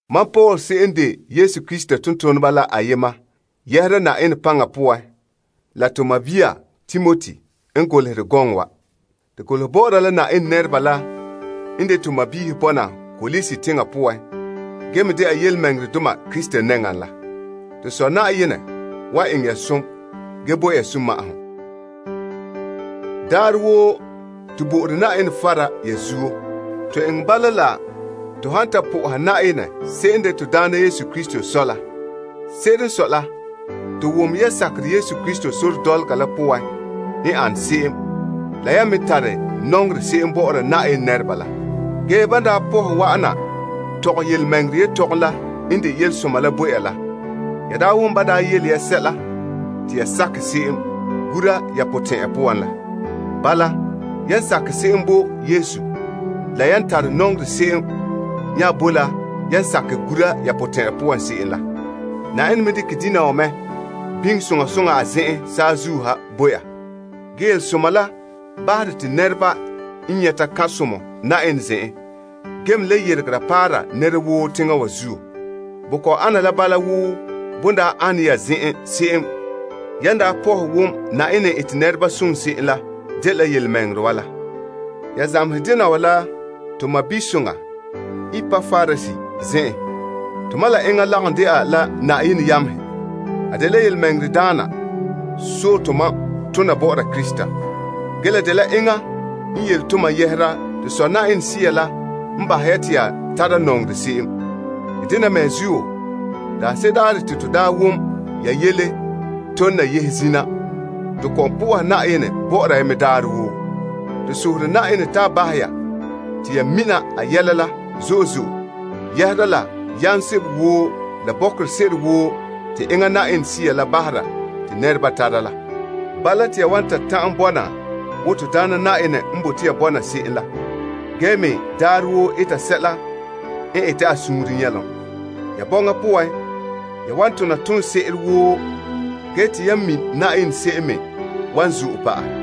Mam Paul se'em n de Yesu Krista tontoneba la ayema yɛhera doohe la Yenɛ potɛn'ɛrɛ poan la la to sɔɔn Timoti n golehɛ gɔŋɔ wa. To golehɛ bɔ'ɔra la Yenɛ nɛreba la n de to sɔɔnrɔ bɔna Kolose teŋa poan dɛna birikindoma Krista nɛŋa la. To Sɔ Yenɛ wan eŋɛ ya zo'ohogɔ gee bo ya sunma'ahom. Daarɛ woo, to bo'ore Yenɛ fara ya zuo. To eŋɛ bala la to han ta po'ohɛ Yenɛ se'em n de to Na'ayenɛ Yesu Krista Sɔ la. Se'ere n sɔe la, to wom ya sakerɛ Krista Yesu sore dɔlɔga la poan n ane se'em la yan me tare nɔŋerɛ se'em bɔ'ɔra Yenɛ nɛreba la. Ge ban daa pɔhɛ wa'ana tɔgɛ yelemɛŋɛrɛ yetɔgom la n de yelesoma la bo ya la, ya daa wom ban daa yele sɛla te ya sakɛ se'em gura ya potɛn'ɛra poan la. Bala, yan sakɛ se'em bo Yesu, la yan tare nɔŋerɛ se'em nya boe la yan sakɛ se'em gura ya potɛn'ɛra poan la. Yenɛ me dekɛ dena wa me biŋe soŋa soŋa a zen'en saazuo ha bo ya. Ge Yelesoma la bahere te nɛreba n nyɛta kan'somɔ Yenɛ zen'en ge me le yeregera paara nɛra woo teŋa wa zuo. Bo kɔ'ɔn ana la bala wo bon daa ane ya zen'en se'em yan daa pɔhɛ wom Yenɛ n ete nɛreba som se'em la dela yelemɛŋɛrɛ wa la. Ya zamehɛ dena wa la to sɔɔnsoŋa Epapras zen'en. Tomam la enŋa lagom dɛna la Yenɛ yamehe. A dela birikindaana sɔe tomam tona bɔ'ɔra Krista. Ge la dela enŋa n yele tomam yɛhera Sea la n bahɛ ya te ya tara nɔŋerɛ se'em. Te dena mea zuo daanse'ere daarɛ te to daa wom ya yele tole na yehe zina, to kɔ'ɔn po'oha Yenɛ bɔ'ɔra ya mɛ daarɛ woo. To sohore Yenɛ te a bahɛ ya te ya mina a yɛla la yɛhera la yam sebo woo la bɔkerɛ se'ere woo te enŋa Sea la bahera te nɛreba tara la. Bala te ya wan ta'an bɔna wo Na'ayenɛ n bote ya bɔna se'em la ge me daarɛ woo eta sɛla n ete a suunre nyɛlom. Ya bɔŋa poan, ya wan tona tonsoŋse'ere woo ge te ya mi' Yenɛ se'em me wan zo'e pa'ahɛ.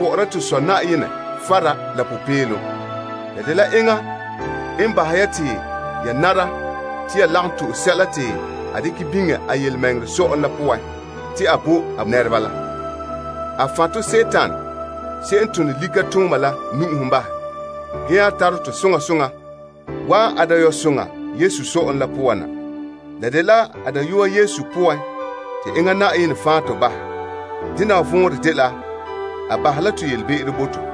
bɔ'ɔra to Sɔ Yenɛ fara. La dela enŋa n bahɛ ya te ya nara te ya lagom to'e sɛla te a dekɛ biŋe a yelemɛŋɛrɛ sɔ'ɔlom la poan te a bo a nɛreba la. A fan' tɔ la likatooma poan bahɛ, ge nya tare tɔ soŋa soŋa wa'an a dayɔba'arɛ Yesu sɔ'ɔlom la poan na. La dela a Dayɔa Yesu poan te enŋa Yenɛ fan' to bahɛ. Dena wa vɔnrɛ dela a bahɛ la to yelebe'ero bo to.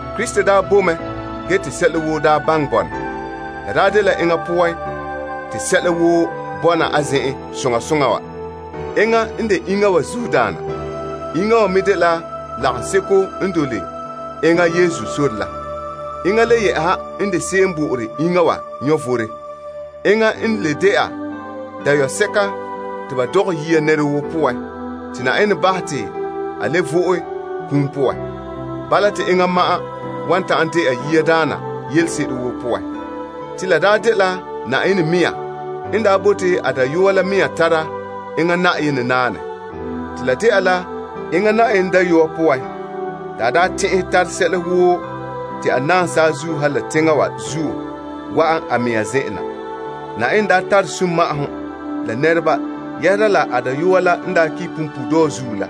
Krista daa boe mɛ ge te sɛla woo daa baŋɛ bɔna. La daa dela enŋa poan te sɛla woo bɔna a zen'en soŋa soŋa wa. Enŋa n de iŋa wa zuodaana. Iŋa wa me dela lagaŋseko n dole enŋa Yesu sore la. Enŋa le yɛ'ɛha n de se'em n bo'ore iŋa wa vom. Enŋa n le dɛna Dayɔdeeŋa nɛra woo poan la, te Yenɛ bahɛ te a le vo'e a kum poan. Bala te enŋa ma'an wan ta'an dɛna yiadaana yelese'ere woo poan. La daa dela Yenɛ mɛŋa n daa bote te a Dayɔa la mɛŋa tara Yenɛ naanɛ la zan'an a poan. Te la dɛna la enŋa Yenɛ Dayɔa poan te a daa tɛn'ɛhɛ tare sɛla woo te a naam saazuo ha la teŋa wa zuo lebe a mɛŋa zen'en na. Yenɛ daa eŋɛ sunma'ahom la nɛreba doohe la a Dayɔa la kum punpuuredɔɔ zuo la.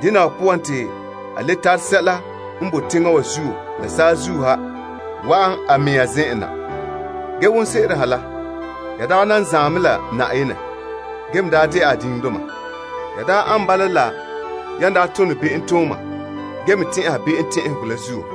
Dena wa poan te a le tare sɛla woo n boe teŋa wa zuo la saazuo ha lebe a mɛŋa zen'en na. Ge wonse'eren ha la, ya daa nan zaan mɛ la Yenɛ ge me daa dɛna a diŋdoma. Ya daa ane bala la yan daa tone be'emtooma ge me tɛn'ɛha be'em tɛn'ɛhegɔ la zuo.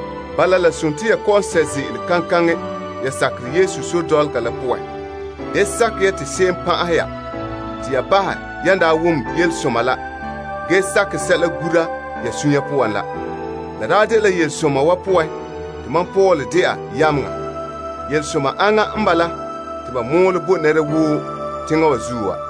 Bala, dene ya birikindoma ge sɛ' ze'ele kaŋkaŋɛ ya sakerɛ Yesu sore dɔlɔga la poan. Da bahɛ te sɛla min ya yan sakɛ ge gura sɛla ya suunre poan la. La daa dela yelesoma wa poan te mam Paul dɛna yameŋa. Yelesoma aŋa n bala te ba mɔɔlɛ bo nɛra woo teŋa wa zuo wa.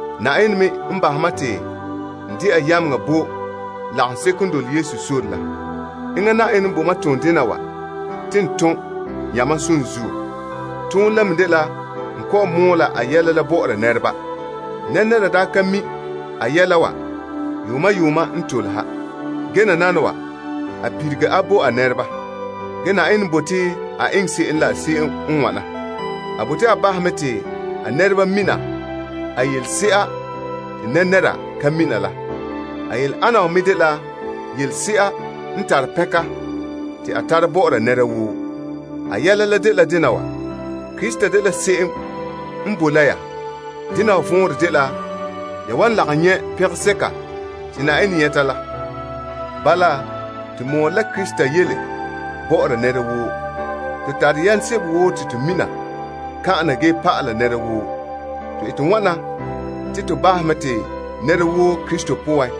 Yenɛ me n bahɛ mam te n dɛna yameŋa bo lagaŋseko n dole Yesu sore la. Enŋa Yenɛ n bo mam toondena wa te n tom yamam som zuo. Toonɛ la me dela n kɔ'ɔn mɔɔla a yɛla la bɔ'ɔra nɛreba. Nɛra daa ka mi' a yɛla wa yuuma yuuma n tole ha. Ge nananawa, a lilige a bo a nɛreba. Ge Yenɛ n bote a eŋɛ se'em n wana: A bote a bahɛ mɛ te a nɛreba mina a yelese'a te nɛra ka mina la. A yele ana wa dela yelese'a n tare pɛnka kantɛ. Yele la dela, Krista n boe ya poan la zuo te ya wan nyɛ' Yenɛ pɛnka soŋa la. Bala, to mɔɔlɛ la Krista yele bɔ'ɔra nɛra woo. To tare yam sebo woo te to mina kan'ana ge pa'ala nɛra woo. To ete wana te to bi'ihe nɛra woo Krista poan.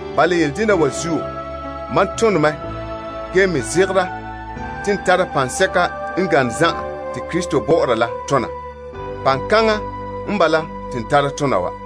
Bala, yele dena wa zuo, mam tone mɛ ge me zegera te n tara paŋsɛka n gane zan'an te Krista bɔ'ɔra la tona. Paŋkaŋa n bala te n tara tona wa.